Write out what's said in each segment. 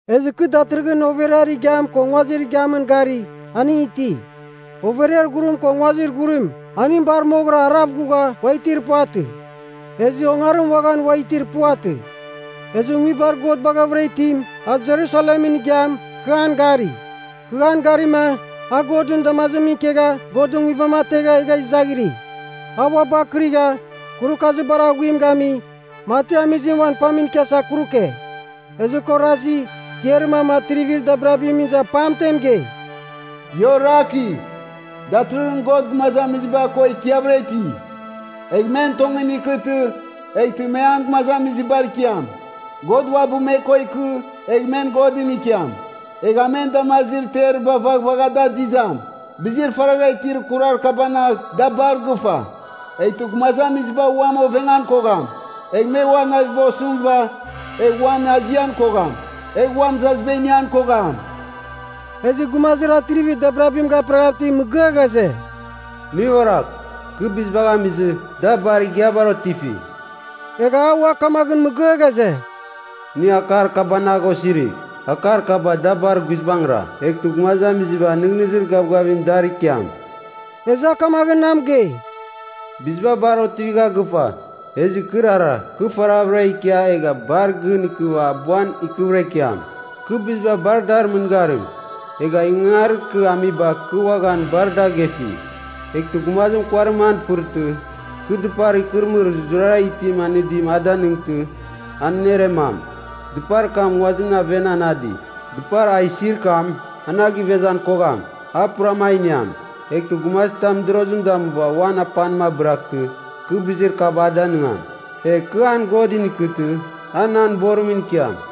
Ezɨ kɨ datɨrɨghɨn overiar igiam ko nguazir igiamɨn gari, aning iti. Overiar ghurim ko nguazir ghurim, aning bar moghɨra arav ghugha ua itir puvatɨ. Ezɨ ongarim uaghan ua itir puvatɨ. Ezɨ Nguibar God Baghavɨra Itim, a Jerusalemɨn igiam, kɨ an gari. Kɨ an garima, a Godɨn damazimɨn ikegha Godɨn Nguibam ategha egha izaghiri. A uabɨ akɨrigha, kurukazir bar aghuim gami, mati amizim uan pamɨn ikiasa kuruke. Ezɨ kɨ orazi, tiarir mam atrivir dabirabimɨn iza pamtem mɨgei, “Ia orakigh. Datɨrɨghɨn God gumazamiziba ko ikiavɨra iti! Egh men tongɨn ikɨtɨ eghtɨ me an gumazamizibar ikiam. God uabɨ me ko ikɨ egh men Godɨn ikiam. Egh a men damazir teriba vaghvagh da adizam. Bizir faragha itir kurar kabanagh da bar gɨfa. Eghtɨ gumazamiziba uam ovengan kogham, egh me ua naviba osɨmɨva egh uam azian kogham, egh ua mɨzaziba inian kogham.” Ezɨ gumazir atrivir dabirabim gaperaghav itim mɨgɨa ghaze, “Nɨ oragh! Kɨ bizibagh amizɨ, da bar igiabar otifi.” Egha a ua kamagh mɨgɨa ghaze, “Nɨ akar kabanagh osirigh. Akar kaba da bar guizbangɨra, eghtɨ gumazamiziba nɨghnɨzir gavgavimɨn dar ikiam.” Ezɨ a kamaghɨn na mɨgei, “Biziba bar otivigha gɨfa. Ezɨ kɨrara, kɨ faraghavɨra ikia egh bar gɨn ikɨva abuan ikɨvɨra ikiam. Kɨ biziba bar dar mɨngarim, egha ingangarir kɨ amiba kɨ uaghan bar dagefi. Eghtɨ gumazim kuarim an pɨrtɨ, kɨ dɨpar ikɨrɨmɨrir zurara itim anɨdim a danɨngtɨ, an aneremam. Dɨpar kam nguazimɨn aven anadi. Dɨpar a isir kam, an a givezan kogham, a puram a iniam. Eghtɨ gumazitam mɨdorozim damuva uan apanim abɨraghtɨ, kɨ bizir kaba a danɨngam. Egh kɨ an Godɨn ikɨtɨ, a nan borimɨn ikiam.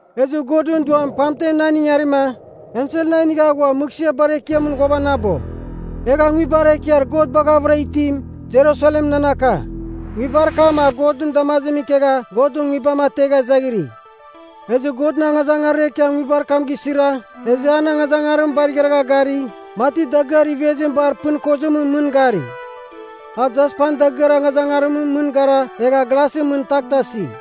Ezɨ Godɨn Duam pamtem nan ingarima, ensel na inigha ghua mɨghsɨar bar ekiamɨn ghuavanabo. Egha Nguibar Ekiar God Baghavɨra Itim, Jerusalem nan aka. Nguibar kam a Godɨn damazimɨn ikegha Godɨn Nguibam ategha izaghiri. Ezɨ Godɨn angazangarir ekiam nguibar kam gisira, ezɨ an angazangarim bar igharagha gari, mati dagɨar ivezim bar pɨn kozimɨn mɨn gari. A jaspan dagɨar angazangarimɨn mɨn gara egha glasɨn mɨn taghtasi.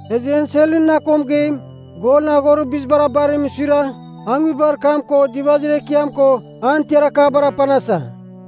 Ezɨ enselɨn na ko mɨgeim, golɨn aghorir bizibar abarimɨn suira, a nguibar kam ko dɨvazir ekiam ko an tiar akabar apanasa.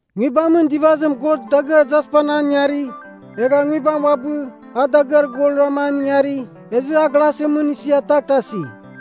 Nguibamɨn dɨvazim God dagɨar jaspan an ingari, egha nguibam uabɨ a dagɨar golrama an ingari, ezɨ a glasɨn mɨn isia taghtasi.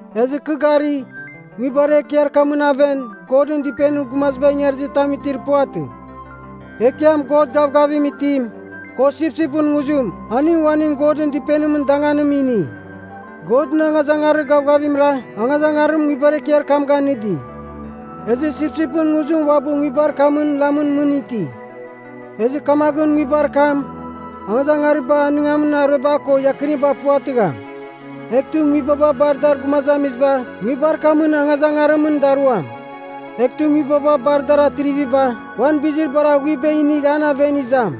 Ezɨ kɨ gari, nguibar ekiar kamɨn aven Godɨn Dɨpenir gumaziba ingarizɨ tam itir puvatɨ. Ekiam, God gavgavim itim, ko sipsipɨn nguzim, aning uaning Godɨn Dɨpenimɨn danganim ini. Godɨn angazangarir gavgavimra angazangarim nguibar ekiar kam ganɨdi. Ezɨ sipsipɨn nguzim uabɨ nguibar kamɨn lamɨn mɨn iti. Ezɨ kamaghɨn nguibar kam angazangariba anɨngamin arueba ko iakɨniba puvatɨgham. Eghtɨ nguibaba bar dar gumazamiziba nguibar kamɨn angazangarimɨn daruam. Eghtɨ nguibaba bar dar atriviba uan bizir bar aghuiba inigh an aven izam.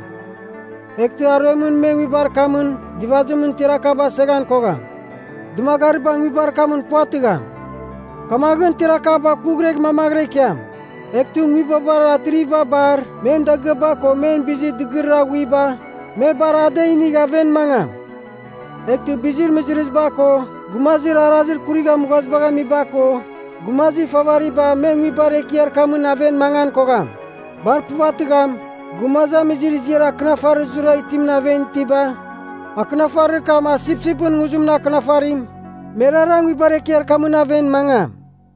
Eghtɨ aruemɨn me nguibar kamɨn dɨvazimɨn tiar akaba aseghan kogham. Dɨmagariba nguibar kamɨn puvatɨgham. Kamaghɨn tiar akaba kuighregh mamaghɨra ikiam. Eghtɨ nguibabar atriviba bar men dagɨaba ko men bizir dɨgɨrir aghuiba, me bar ada inigh aven mangam. Eghtɨ bizir mɨzɨrɨziba ko gumazir arazir kurigha mughazibagh amiba ko, gumazir ifavariba me nguibar ekiar kamɨn aven mangan kogham. Bar puvatɨgham, gumazamizir ziar akɨnafarir zurara itimɨn aven itiba, akɨnafarir kam a sipsipɨn nguzimɨn akɨnafarim, merara nguibar ekiar kamɨn aven mangam.